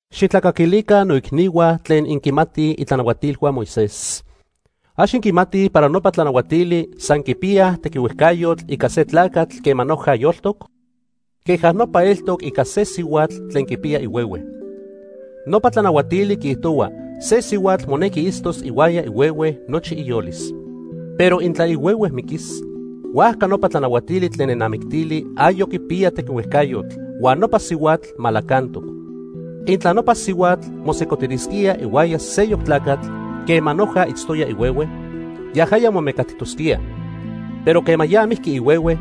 Xijtlacaquilica noicnihua tlen inquinmatij itlanahuatilhua Moisés. ¿Ax inquimatij para nopa tlanahuatili san quipiyaj tequihuejcayotl ica se tlacatl quema noja yoltoc? Queja nopa eltoc ica se sihuatl tlen quipiya ihuehue. Nopa tlanahuatili quiijtohua se sihuatl monequi itztos ihuaya ihuehue nochi iyolis. Pero intla ihuehue miquis, huajca nopa tlanahuatili tlen nenamictili ayoc quipiya tequihuejcayotl, huan nopa sihuatl malacantoc. Intla nopa sihuatl mosejcotilisquía ihuaya seyoc tlacatl quema noja itztoya ihuehue, yajaya momecatijtosquía. Pero quema ya mijqui ihuehue,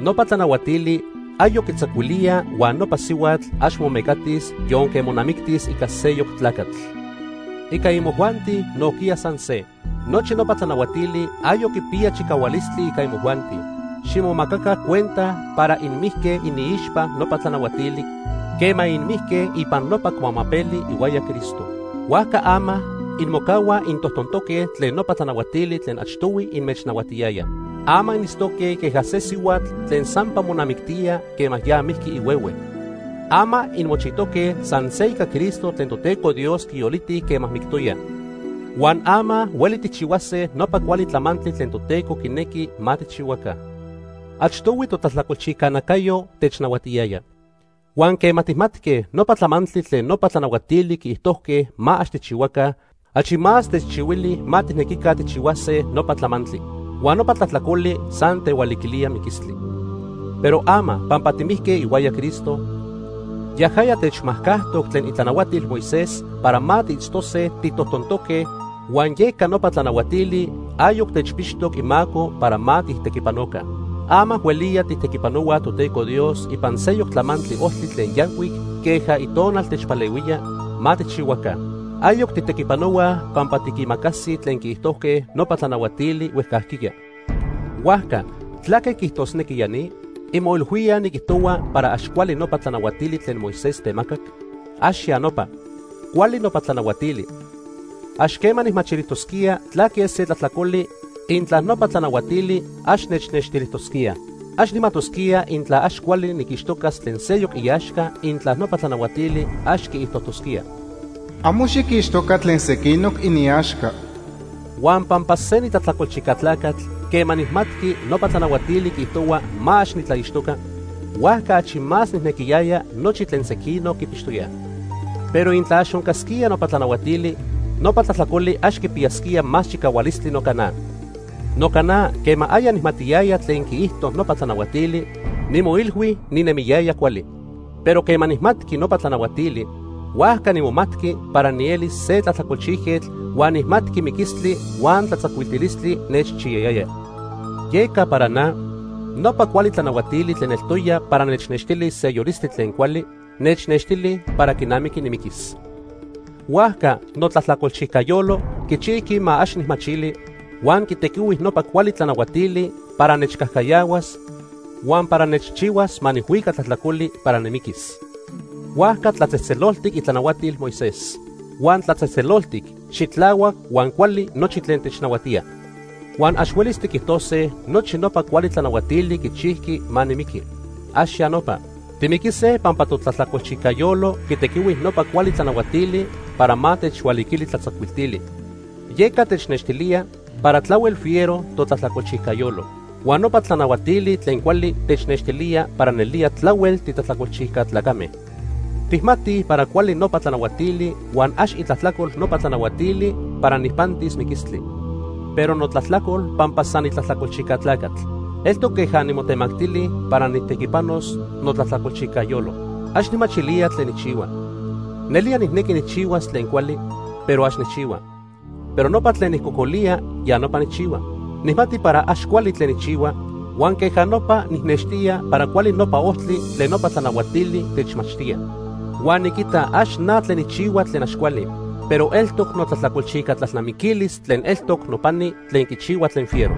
nopa tlanahuatili ayoc quitzacuilía huan nopa sihuatl ax momecatis yonque monamictis ica seyoc tlacatl. Ica imojuanti nojquiya san se. Nochi nopa tlanahuatili ayoc quipiyaj chicahualistli ica imojuanti. Ximomacaca cuenta para inmijque iniixpa nopa tlanahuatili quema inmijque ipan nopa cuamapeli ihuaya Cristo. Huajca ama inmocahuaj intojtontoque tlen nopa tlanahuatili tlen achtohui inmechnahuatiyaya. Ama initztoque queja se sihuatl tlen sampa monamictía quema ya mijqui ihuehue. Ama inmochijtoque san se ica Cristo tlen Toteco Dios quiyoliti quema mictoya. Huan ama hueli tijchihuase nopa cuali tlamantli tlen Toteco quinequi ma tijchihuaca. Achtohui totlajtlacolchijca nacayo technahuatiyaya. Huan quema tijmatque nopa tlamantli tlen nopa tlanahuatili quiijtojque ma ax tijchihuaca, achi más techchihuili ma tijnequica tijchihuase nopa tlamantli. Huan nopa tlajtlacoli san tehualiquilía miquistli. Pero ama pampa timijque ihuaya Cristo, yajaya techmajcajtoc tlen itlanahuatil Moisés para ma tiitztose titojtontoque huan yeca nopa tlanahuatili ayoc techpixtoc imaco para ma tijtequipanoca. Ama hueliya tijtequipanohuaj Toteco Dios ipan seyoc tlamantli ojtli tlen yancuic queja Itonal techpalehuía ma tijchihuaca. Ayoc tijtequipanohuaj pampa tiquimacasij tlen quiijtojque nopa tlanahuatili huejcajquiya. Huajca ¿tlaque quiijtosnequi ya ni? ¿Inmoilhuíaj niquijtohua para ax cuali nopa tlanahuatili tlen Moisés temacac? ¡Ax ya nopa! Cuali nopa tlanahuatili. Ax quema nijmachilijtosquía tlaque se tlajtlacoli intla nopa tlanahuatili ax nechnextilijtosquíaj. Ax nijmajtosquía intla ax cuali niquixtocas tlen seyoc iaxca intla nopa tlanahuatili ax quiijtojtosquía: “Amo xiquixtoca tlen sequinoc iniaxca.” Huan pampa se nitlajtlacolchijca tlacatl, quema nijmatqui nopa tlanahuatili quiijtohua ma ax nitlaixtoca, huajca achi más nijnequiyaya nochi tlen sequinoc quipixtoyaj. Pero intla ax oncasquía nopa tlanahuatili, nopa tlajtlacoli ax quipiyasquía más chicahualistli noca na. Noca na quema aya nijmatiyaya tlen quiijto nopa tlanahuatili, nimoilhui ninemiyaya cuali, pero quema nijmatqui nopa tlanahuatili, huajca nimomatqui para nieli se tlajtlacolchijquetl huan nijmatqui miquistli huan tlatzacuiltilistli nechchiyayaya. Yeca para na, nopa cuali tlanahuatili tlen eltoya para nechnextilis se yolistli tlen cuali, nechnextili para quinamiqui nimiquis. Huajca notlajtlacolchijca yolo quichijqui ma ax nijmachili, huan quitequihui nopa cuali tlanahuatili para nechcajcayahuas huan para nechchihuas ma nijhuica tlajtlacoli para nimiquis. Huajca tlatzejtzeloltic itlanahuatil Moisés. Huan tlatzejtzeloltic, xitlahuac huan cuali nochi tlen technahuatía. Huan ax huelis tiquijtose nochi nopa cuali tlanahuatili quichijqui ma nimiqui. ¡Ax ya nopa! Timiquise pampa totlajtlacolchijca yolo quitequihui nopa cuali tlanahuatili para ma techhualiquili tlatzacuiltili. Yeca technextilía para tlahuel fiero totlajtlacolchijca yolo. Huan nopa tlanahuatili tlen cuali technextilíaj para nelía tlahuel titlajtlacolchijca tlacame. Tijmatij para cuali nopa tlanahuatili huan ax itlajtlacol nopa tlanahuatili para nijpantis miquistli, pero notlajtlacol pampa san nitlajtlacolchijca tlacatl. Eltoc queja nimotemactili para nijtequipanos notlajtlacolchijca yolo. Ax nijmachilía tlen nijchihua. Nelía nijnequi nijchihuas tlen cuali, pero ax nijchihua. Pero nopa tlen nijcocolía, ya nopa nijchihua. Nijmati para ax cuali tlen nijchihua, huan queja nopa nijnextía para cuali nopa ojtli tlen nopa tlanahuatili techmachtíaj. Huan niquita ax na tlen nijchihua tlen ax cuali, pero eltoc notlajtlacolchijca tlalnamiquilis tlen eltoc nopani tlen quichihua tlen fiero.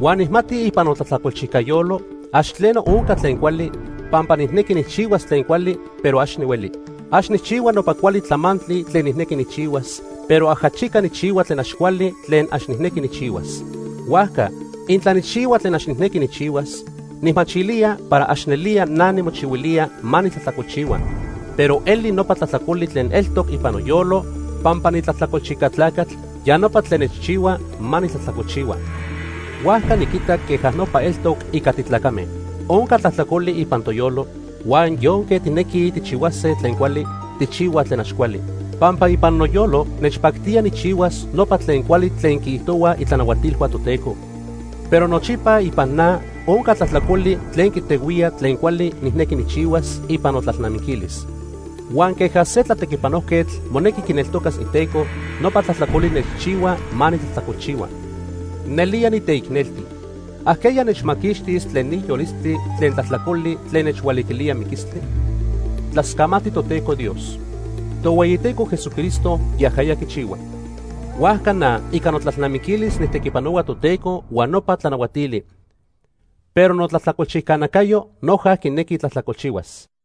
Huan nijmati ipan notlajtlacolchijca yolo, ax tleno onca tlen cuali, pampa nijnequi nijchihuas tlen cuali, pero ax nihueli. Ax nijchihua nopa cuali tlamantli tlen nijnequi nijchihuas, pero ajachica nijchihua tlen ax cuali tlen ax nijnequi nijchihuas. Huajca, intla nijchihua tlen ax nijnequi nijchihuas, nijmachilía para ax nelía na nimochihuilía ma nitlajtlacolchihua. Pero eli nopa tlajtlacoli tlen eltoc ipan noyolo pampa nitlajtlacolchijca tlacatl, ya nopa tlen nechchihua ma nitlajtlacolchihua. Huajca niquita queja nopa eltoc ica titlacame. Onca tlajtlacoli ipan toyolo, huan yonque tijnequij tijchihuase tlen cuali, tijchihuaj tlen ax cuali. Pampa ipan noyolo nechpactía nijchihuas nopa tlen cuali tlen quiijtohuaj itlanahuatilhua Toteco, pero nochipa ipan na onca tlajtlacoli tlen quitehuía tlen cuali nijnequi nijchihuas ipan notlalnamiquilis. Huan queja se tlatequipanojquetl monequi quineltocas iteco, nopa tlajtlacoli nechchihua ma nitlajtlacolchihua. ¡Nelía niteicnelti! ¿Ajqueya nechmaquixtis tlen ni yolistli tlen tlajtlacoli tlen nechhualiquilía miquistli? Tlascamati Toteco Dios. Tohueyiteco Jesucristo yajaya quichihua. Huajca na ica notlalnamiquilis nijtequipanohua Toteco huan nopa tlanahuatili, pero notlajtlacolchijca nacayo noja quinequi tlajtlacolchihuas.